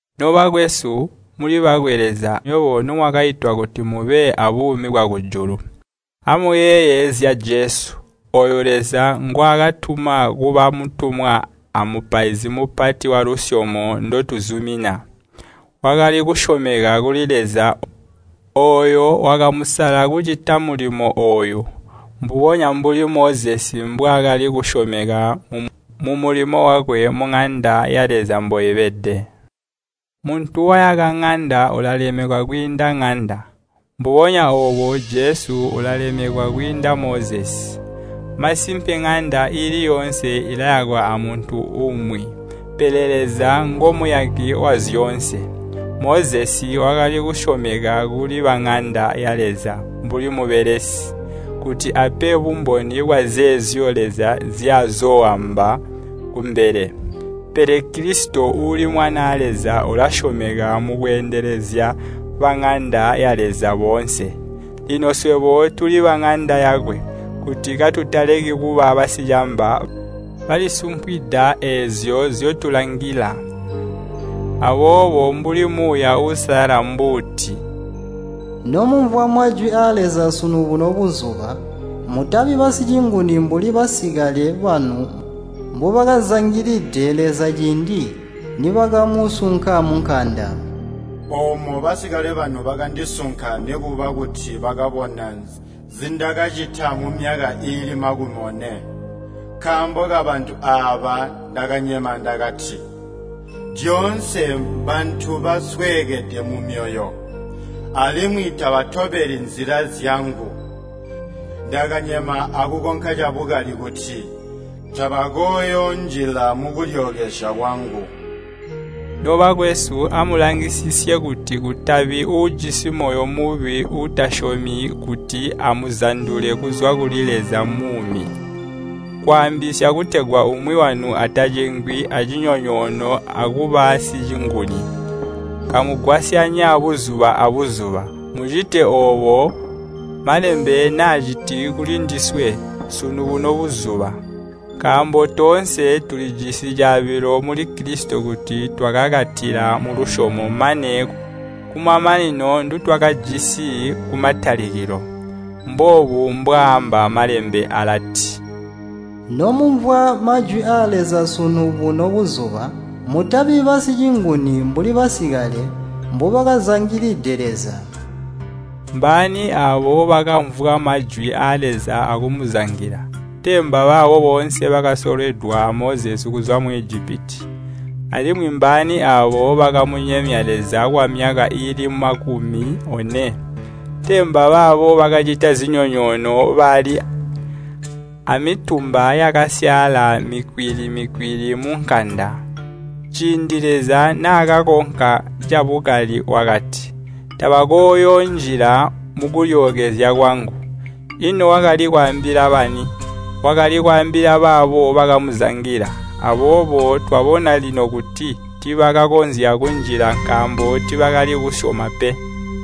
Nobakwesu, muli bakwe Leza, nywebo nomwakaitwa kuti mube aabuumi bwakujulu. Amuyeeye zya Jesu, ooyo Leza ngwaakatuma kuba Mutumwa a Mupaizi Mupati walusyomo ndotuzumina. Wakali kusyomeka kuli Leza, ooyo wakamusala kucita mulimo ooyu, mbubonya mbuli Mozesi mbwaakali kusyomeka mumulimo wakwe muŋanda ya Leza mboibede. Muntu wayaka ŋanda ulalemekwa kwiinda ŋanda. Mbubonya oobo Jesu ulalemekwa kwiinda Mozesi. Masimpe ŋanda iili yoonse ilayakwa amuntu umwi. Pele Leza ngomuyaki wa zyoonse. Mozesi wakali kusyomeka kuli baŋanda ya Leza mbuli mubelesi, kuti ape bumboni bwazeezyo Leza nzyazooamba kumbele. Pele Kilisito uuli Mwanaa Leza ulasyomeka mukweendelezya baŋanda ya Leza boonse. Lino swebo tuli baŋanda yakwe, kuti katutaleki kuba basicamba balisumpwida eezyo nzyotulangila. Aboobo, mbuli Muuya Uusalala mbuuti, “Nomumvwa majwi aa Leza sunu buno buzuba, mutabi basicinguni mbuli basikale banu mbubakazangilide Leza ciindi nibakamusunka munkanda. Oomo basikale banu bakandisunka nikuba kuti bakabona nzindakacita mumyaka iili makumi one. Nkaambo kabantu aaba ndakanyema ndakati, ‘Lyoonse mbantu basweekede mumyoyo, alimwi tabatobeli nzila zyangu.’ Ndakanyema akukonka cabukali kuti, ‘Tabakooyoonjila mukulyookezya kwangu.’” Nobakwesu, amulangisisye kuti kutabi uujisi moyo mubi uutasyomi kuti amuzandule kuzwa kuli Leza muumi. Kwaambisya, kutegwa umwi wanu atacengwi a cinyonyoono akuba sicinguni, kamugwasyanya buzuba a buzuba, mucite oobo Malembe naaciti kuli ndiswe “Sunu buno buzuba.” Nkaambo toonse tulijisi caabilo muli Kilisito kuti twakakatila mulusyomo mane kumamanino ndutwakajisi kumatalikilo. Mboobu mbwaaamba Malembe alati, “Nomumvwa majwi aa Leza sunu buno buzuba, mutabi basicinguni mbuli basikale mbubakazangilide Leza.” Mbaani aabo bakamvwa majwi aa Leza akumuzangila? Tee mbabaabo boonse bakasolwedwa a Mozesi kuzwa mu Ijipiti? Alimwi mbaani aabo bakamunyemya Leza kwamyaka iili makumi one? Tee mbabaabo bakacita zinyonyoono bali aamitumba yakasyaala mikwili-mikwili munkanda? Ciindi Leza naakakonka cabukali wakati, “Tabakooyoonjila mukulyookezya kwangu.” Ino wakali kwaambila bani? Wakali kwaambila baabo bakamuzangila. Aboobo twabona lino kuti tiibakakonzya kunjila nkaambo tiibakali kusyoma pe.